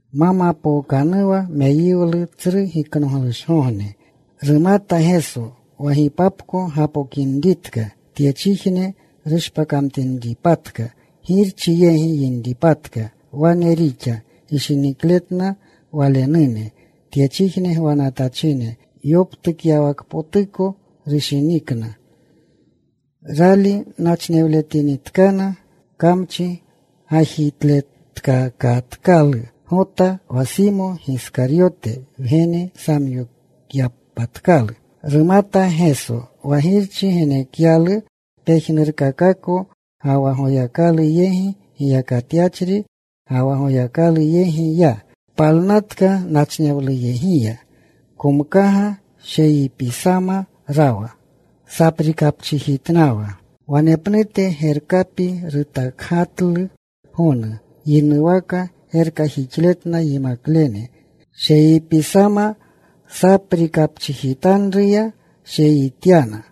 Ma mapookanuwa meyiwlu Tsru Giknoglushgogne, rumata Geso wa gipapko gapokinritka, tyechijne rushpakinripatka, Girchi yegi yinripatka. Wane rixa gishinikletna Walenune tyechijne gwanatachine, yoptukyawakpotuko rushinikna. Rali nachinewletinitkana kamchi gajitletkakatkalu Gota, wa Simo Giskaryote wgene, samyokyapatkalu. Rumata Geso wa Girchi genekyalu pejnurkakako, ga wa Goyakalu yegi giyakatyachri, ga wa Goyakalu yegi ya. Palnatka nachnewluyegiya. Komkaga. Sheyipisama rawa. Saprikapchijitnawa. Wanepnute gerkapi rutakgatlu gonu. Yinuwaka gerkajixletna yimaklene. Sheyipisama saprikapchijitanruya sheyityana.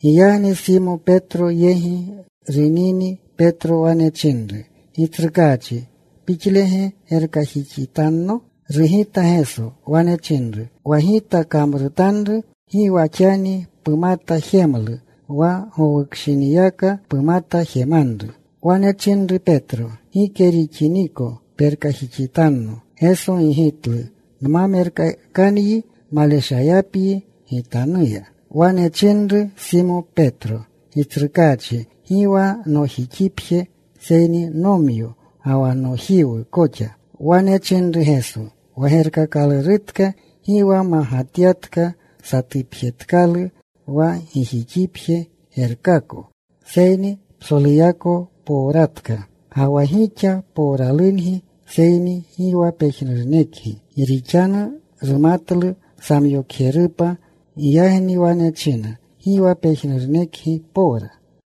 Giyagni Simo Petro yegi runini, Petro wane chinru, “Gitsrukaachi, ¿Pixlege gerkajixitanno?” Rugita Geso. Wane chinru, “Wa Gita kamrutanru, gi wa xani pumata jemlu. Wa gowukshiniyaka pumata jemanru.” Wane chinru Petro, “Gike pixiniko perkajixitanno.” Geso gigitlu, “Nma merkakanyi maleshayapyi Gitanuya.” Wane chinru Simo Petro, “Gitsrukaachi, gi wa nojixipje, seyni nomyo koxa ga wa nojiwu koxa.” Wane chinru Geso, “Wa gerkakalurutka, gi wa magatatka. Satupjetkalu wa gijixipje gerkako, seyni psoluyako powratka. Ga wa gixa powralungi, seyni gi wa pejnurunekgi.” Gi rixanu rumatlu samyokjerupa. Giyagni wane china, “Gi wa pejnurunekgi powra.”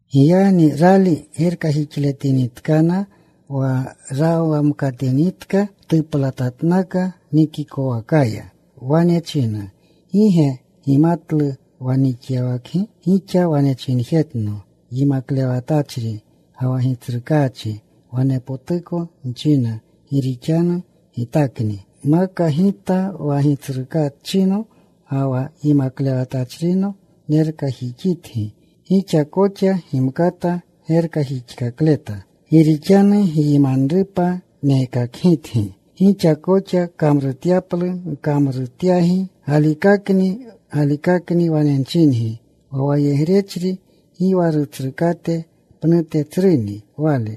Giyagni rali gerkajixitletinitkana, wa rawamkatinitka, tuplatatnaka nikikowakaya. Wane chinna, “¿Gi ge gimatlu wa nixyawakgi? Gixa wane chinjetno, ‘Yimaklewatachri ga wa Gitsrukaachi.’ Wanepotuko nchina, gi rixanu Gitakni. Maka Gita wa Gitsrukaachino ga wa Yimaklewatachrino nerkajixitgi, gixa koxa gimkata gerkajixkakleta. Gi rixanu gyimanrupa nekakgitgi, gixa koxa kamrutyaplu nkamrutyagi. Galikakni, galikakni wane nchingi, wa wayegrechri gi wa rutsrukate pnute tsruni wale.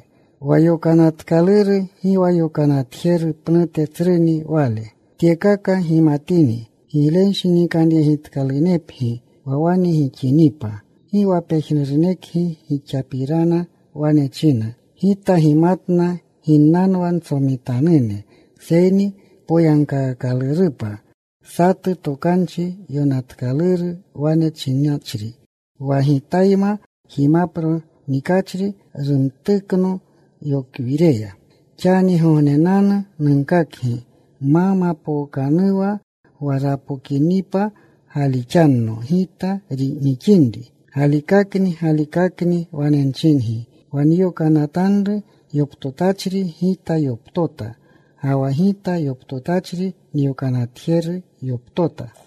Wa yokanatkaluru gi wa yokanatjeru pnute tsruni wale. Tyekaka gimatini, giglenshinikanyegitkalunepgi wa wane gixinipa. “Gi wa pejnurunekgi gixapirana wane nchina. Gita gimatna ginnanwa ntsomitanune, seyni poyagkaakalurupa satu tokanchi yonatkaluru, wane chinachri: Wa Gitayma jimapro nikachri rumtukno yokwireya. “Xanigognenanu nunkakgi ma mapookanuwa, wa rapokinipa galixanno Gita nixinri. Galikakni, galikakni wane nchingi, wa nyokanatanru yoptotachri Gita yoptota. Ga wa Gita yoptotachri nyokanatjeru yoptota.”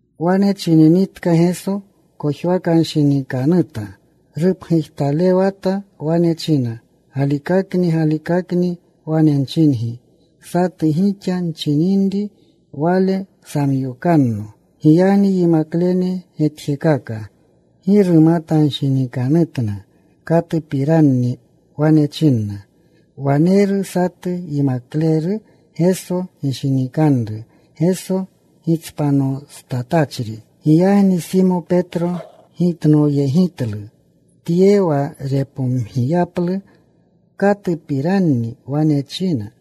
Wane chininitka Geso, kojwakanshinikanuta. Rupgujtalewata. Wane china, “Galikakni, galikakni wane nchingi, satu gixa nchininri wale samyokanno.” Giyagni yimaklene getjekaka. Gi rumatanshinikanutna katupiranni wane china. Waneru satu yimakleru Geso gishinikanru, Geso gitspanostatachri. Giyagni Simo Petro gitnoyegitlu tye, wa repomgiyaplu katupiranni wane china.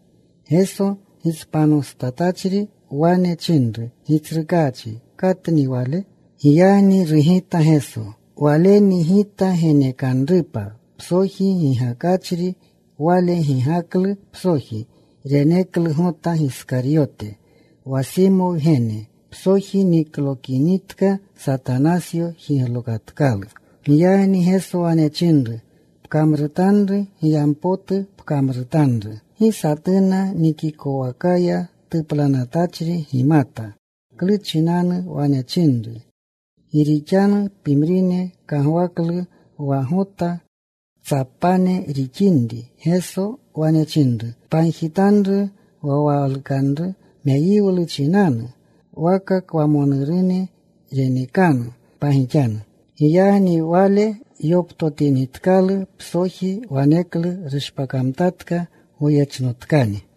Geso gitspanostatachri wane chinru, “Gitsrukaachi, ¿katni wale?” Giyagni rugita Geso, “Waleni Gita genekanrupa psoji gigakachri.” Wale gigaklu psoji. Reneklu Gota Giskaryote, wa Simo wgene. Psoji niklokinitka, Satanasyo jiglokatkalu. Giyagni Geso wane chinru, “Pkamrutanru giyampotu pkamrutanru.” Gi satuna nikikowakaya tuplanatachine gimata klu chinanu wane chinru. Gi rixanu pimrine kagwaklu wa Gota ktsapane rixinri, Geso wane chinru, “Pagjitanru wa walukanru meyiwlu chinanu, waka kwamonurune renekanu pagixanu.” Giyagni wale yoptotinitkalu psoji, waneklu rushpakamtatka. Goyechnotkani.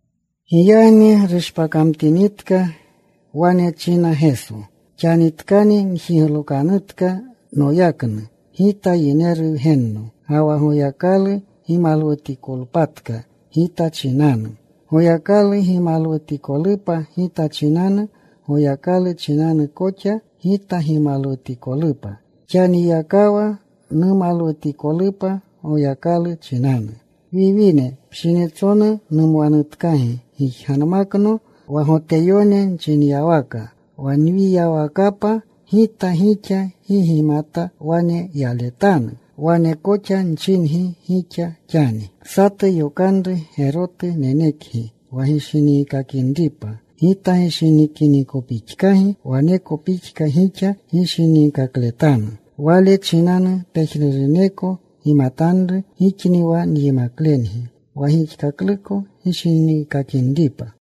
Giyagni rushpakamtinitka, wane china Geso, “Xanitkani njiglokanutka noyaknu Gita Yineru Wgenno. Ga wa Goyakalu gimalwutikolpatka Gita chinanu. Goyakalu gimalwutikolupa Gita chinanu, Goyakalu chinanu koxa Gita gimalwutikolupa. Xaniyakawa numalwutikolupa Goyakalu chinanu. “Wiwine, pshinitsonu numwanutkagi. Gijganmakno. Wa Goteyone nchinyawaka, wa nyiyawakapa Gita, gixa gi gimkata wane yaletanu. Wane koxa nchingi gixa xani. “Satu yokanru gerotu nenekgi, wa gishiniikakinripa. Gita gishinikinikopixkagi, waneko pixka gixa gishiniikakletanu. Wale chinanu pejnuruneko gimatanu gixni wa nyimaklengi, wa gixkakluko gishiniikakinripa.”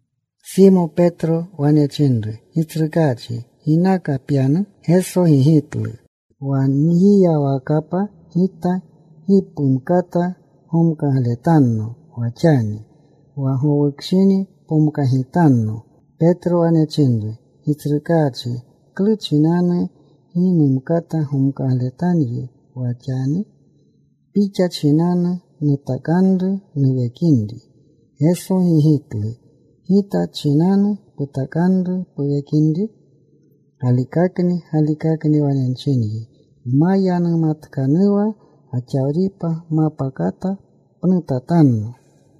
Simo Petro wane chinru, “Gitsrukaachi, ¿ginaka pyanu?” Geso gigitlu, “Wa nyiyawakapa Gita gi pumkata gomkagletanno wa xani. Wa gowukshini pomkagitanno.” Petro wane chinru, “Gitsrukaachi, ¿klu chinanu gi numkata gomkagletanyi wa xani? Pixa chinanu nutakanru nuwekinri.” Geso gigitlu, “¿Gita chinanu putakanru puwekinri? Galikakni, galikakni, wane nchinyi, ma yanumatkanuwa gaxawripa, mapa kata pnutatanno.